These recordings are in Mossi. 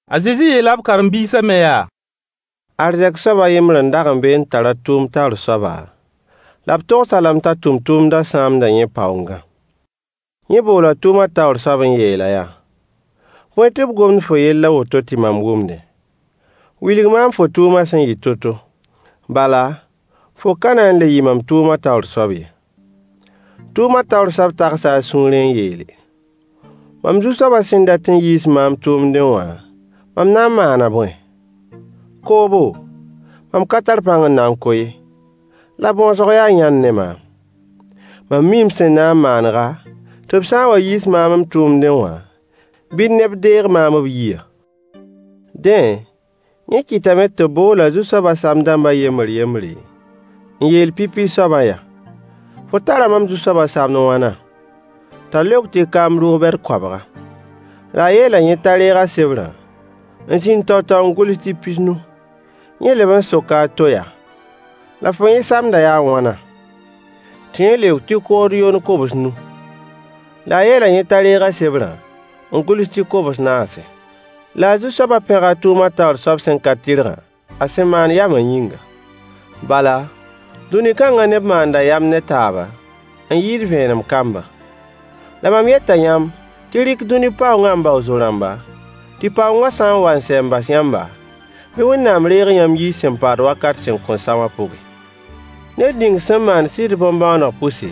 A Zezi yeela b karen-biisã me yaa: Arzɛk soab a yembr n da n be n tar a tʋʋm taoor soaba, la b togs-a lame t'a tʋmtʋmdã sãamda yẽ paoongã. Yẽ boola tʋʋma taoor soab n yeel-a yaa: “Bõe tɩ b gomd fo yell a woto tɩ mam wʋmdẽ? Wilg maam fo tʋʋma sẽn yɩ to-to. Bala, fo ka na n le yɩ mam tʋʋma taoor soab ye.” Tʋʋma taoor soab tagsa a sũurẽ n yeele: “Mam zu-soabã sẽn dat n yiis maam tʋʋmdẽ wã, mam na n maana boẽ? Koobo? Mam ka tar pãng n na n ko ye, la bõsg yaa yãnd ne maam. Mam mii m sẽn na n maanega, tɩ b sã n wa n yiis maam m tʋʋmdẽ wã, bɩ neb deeg maam b yiyã.” Dẽ, yẽ kɩtame tɩ b bool a zu-soaba sam-dãmbã yembr yembre, n yeel pipi soabã yaa: “Fo tara mam zu-soaba samd wãna?” T'a leok tɩ kaam rʋg-bɛd koabga. La a yeela yẽ t'a reeg a sebrã n zĩnd tao-tao n gʋls tɩ pis-nu. Yẽ leb n soka a to yaa: “La fo yẽ samdã yaa wãna?” Tɩ yẽ leok tɩ kood yond kobs-nu. La a yeela yẽ t'a reeg a sebrã n gʋls tɩ kobs-naase. La a zu-soaba pẽga a tʋʋma taoor soab sẽn ka tɩrgã a sẽn maan yama yĩnga. Bala, dũni kanga neb maanda yam ne taaba, n yɩɩd vẽenem kambã. La mam yeta yãmb tɩ y rɩk dũni paoongã n bao zo-rãmba, tɩ paoongã sã n wa n sɛ n bas yãmba, bɩ Wẽnnaam reeg yãmb yiy sẽn paad wakat sẽn kõn sa wã pʋgẽ. Ned ning sẽn maand sɩd bõn-bõoneg pʋse,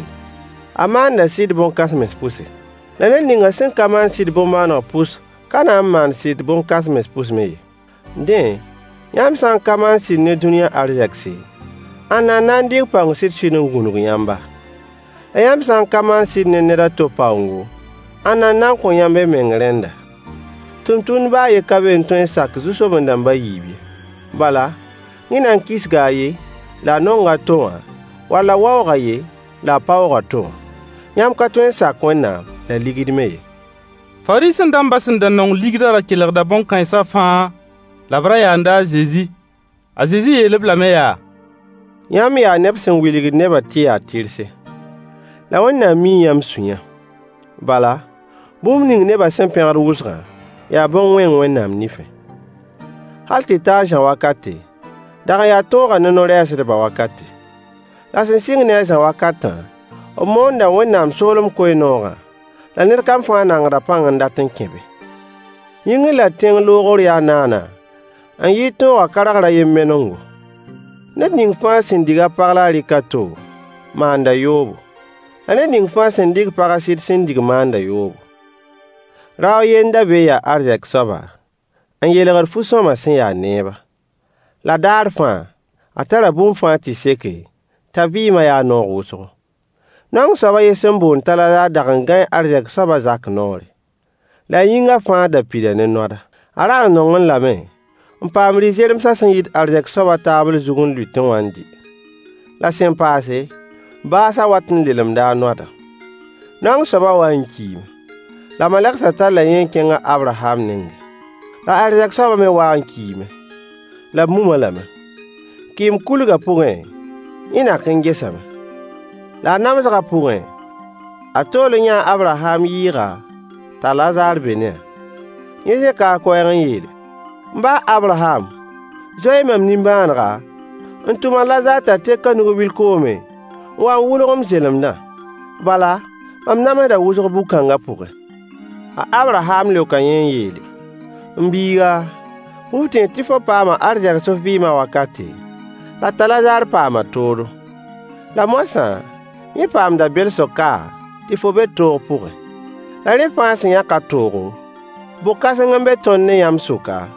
a maanda sɩd bõn-kãsems pʋse. La ned ninga sẽn ka maand sɩd bõn-bõoneg pʋs ka na n maan sɩd bõn-kãsens pʋs me ye. Dẽ, yãmb sã n ka maan sɩd ne dũniyã arzegse, ãnna n na n dɩk paoong sɩd-sɩd n gũnug yãmba? La yãmb sã n ka maan sɩd ne ned a to paoongo, ãnna n na n kõ yãmb y meng rẽnda? Tʋmtʋmd baa a ye ka be n tõe n sak zu-soben-dãmb a yiib ye. Bala, yẽ na n kisga a yen la a nong a to wã, wall a waoog a yen la a paoog a to wã. Yãmb ka tõe sak Wẽnnaam la ligd me ye. Fariisẽ-dãmbã sẽn da nong ligdã ra kelgda bõn-kãensã fãa la b ra yaanda a Zezi. A Zezi yeel-b lame yaa: yãmb yaa neb sẽn wilgd nebã tɩ y yaa tɩrse. La Wẽnnaam mii yãmb sũyã. Bala, bũmb ning neba sẽn pẽgd wʋsgã yaa bõn-wẽng Wẽnnaam nifẽ. Hal tɩ ta a Zã wakate, dag n yaa tõogã ne no-rɛɛsdbã wakate. La sẽn sɩng ne a Zã wakatã, b moonda Wẽnnaam soolem koe-noogã, la ned kam fãa nangda pãng n dat n kẽ be. Yĩngr la tẽng loogr yaa naana n yɩɩd tõogã kargr a yen menengo. Ned ning fãa sẽn dig a pag la a rɩk a to, maanda yoobo. La ned ning fãa sẽn dɩk paga a sɩd sẽn dig maanda yoobo. Rao a ye n da be n ya arzɛk soaba, n yeelgd fu-sõama sẽn ya neeba. La daar fãa, a tara bũmb fãa tɩ seke, t'a vɩɩma ya noog wʋsgo. Naong soab a yen sẽn boond t'a Lazaar dag n gãee arzɛk soabã zak noore. La a yĩnga fãa da pida ne noada. A rag n nongẽ lame n paam rɩ-zeremsã sẽn yit arzɛk soaba taabl zug n lʋɩtẽ wã n dɩ. La sẽn paase, baasã wat n lelemda a noadã. Naong soabã wa n kiime. La malegsã talla yẽ n kẽng a Abraham nengẽ. La arzɛk soabã me wa n kiime, la b mum-a lame. Kɩɩm-kulgã pʋgẽ, yẽ nak n gesame. La a namsgã pʋgẽ, a tool n yãa a Abraham yɩɩga, t'a Lazaar be ne-a. Yẽ zẽka a koɛɛg n yeel: “M ba a Abraham! Zoe-y mam nimbãanega, n tʋm a Lazaar t'a tẽk a nug-bil koomẽ n wa n wʋlg m zelemdã. Bala, mam namsda wʋsg bug-kãnga pʋgẽ.” A Abraham leoka yẽ n yeele: “M biiga, bɩ f tẽeg tɩ fo paama arzegs f vɩɩmã wakate, la t'a Lazaar paama toodo. La moasã, yẽ paamda belsg ka, tɩ fo be toog pʋgẽ. La rẽ fãa sẽn yãk a toogo, bok-kãseng n be tõnd ne yãmb suka,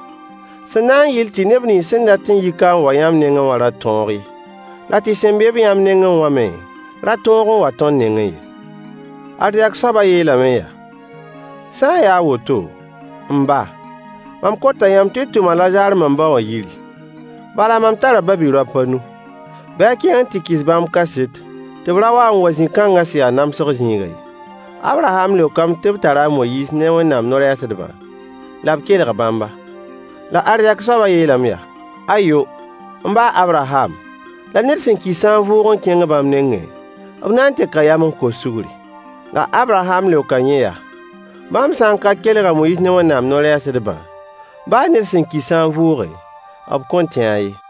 sẽn na n yɩl tɩ neb nins sẽn dat n yi ka n wa yãmb nengẽ wã ra tõog ye, la tɩ sẽn be-b yãmb nengẽ wã me ra tõog n wa tõnd nengẽ ye”. Arzɛk soabã yeelame yaa: “Sã n ya a woto, m ba, mam kota yãmb tɩ y tʋm a Lazaar mam ba wã yiri. Bala mam tara ba-bi-raop a nu. Bɩ a kẽng n tɩ kɩs bãmb kaset tɩ b ra wa n wa zĩ-kãnga sẽn ya namsg zĩigã ye.” A Abraham leokame tɩ b tara a Moyiis ne Wẽnnaam no-rɛɛsdbã, la b kelg bãmba. La arzɛk soabã yeelame yaa: “Ayo, m ba a Abraham! La ned sẽn ki sã n vʋʋg n kẽng bãmb nengẽ, b na n teka yam n kos sugri.” La Abraham leoka yẽ yaa: “Bãmb sã n ka kelg a Moyiis ne Wẽnnaam no-rɛɛsdbã, baa ned sẽn ki sã n vʋʋge, b kõn tẽ-a ye.”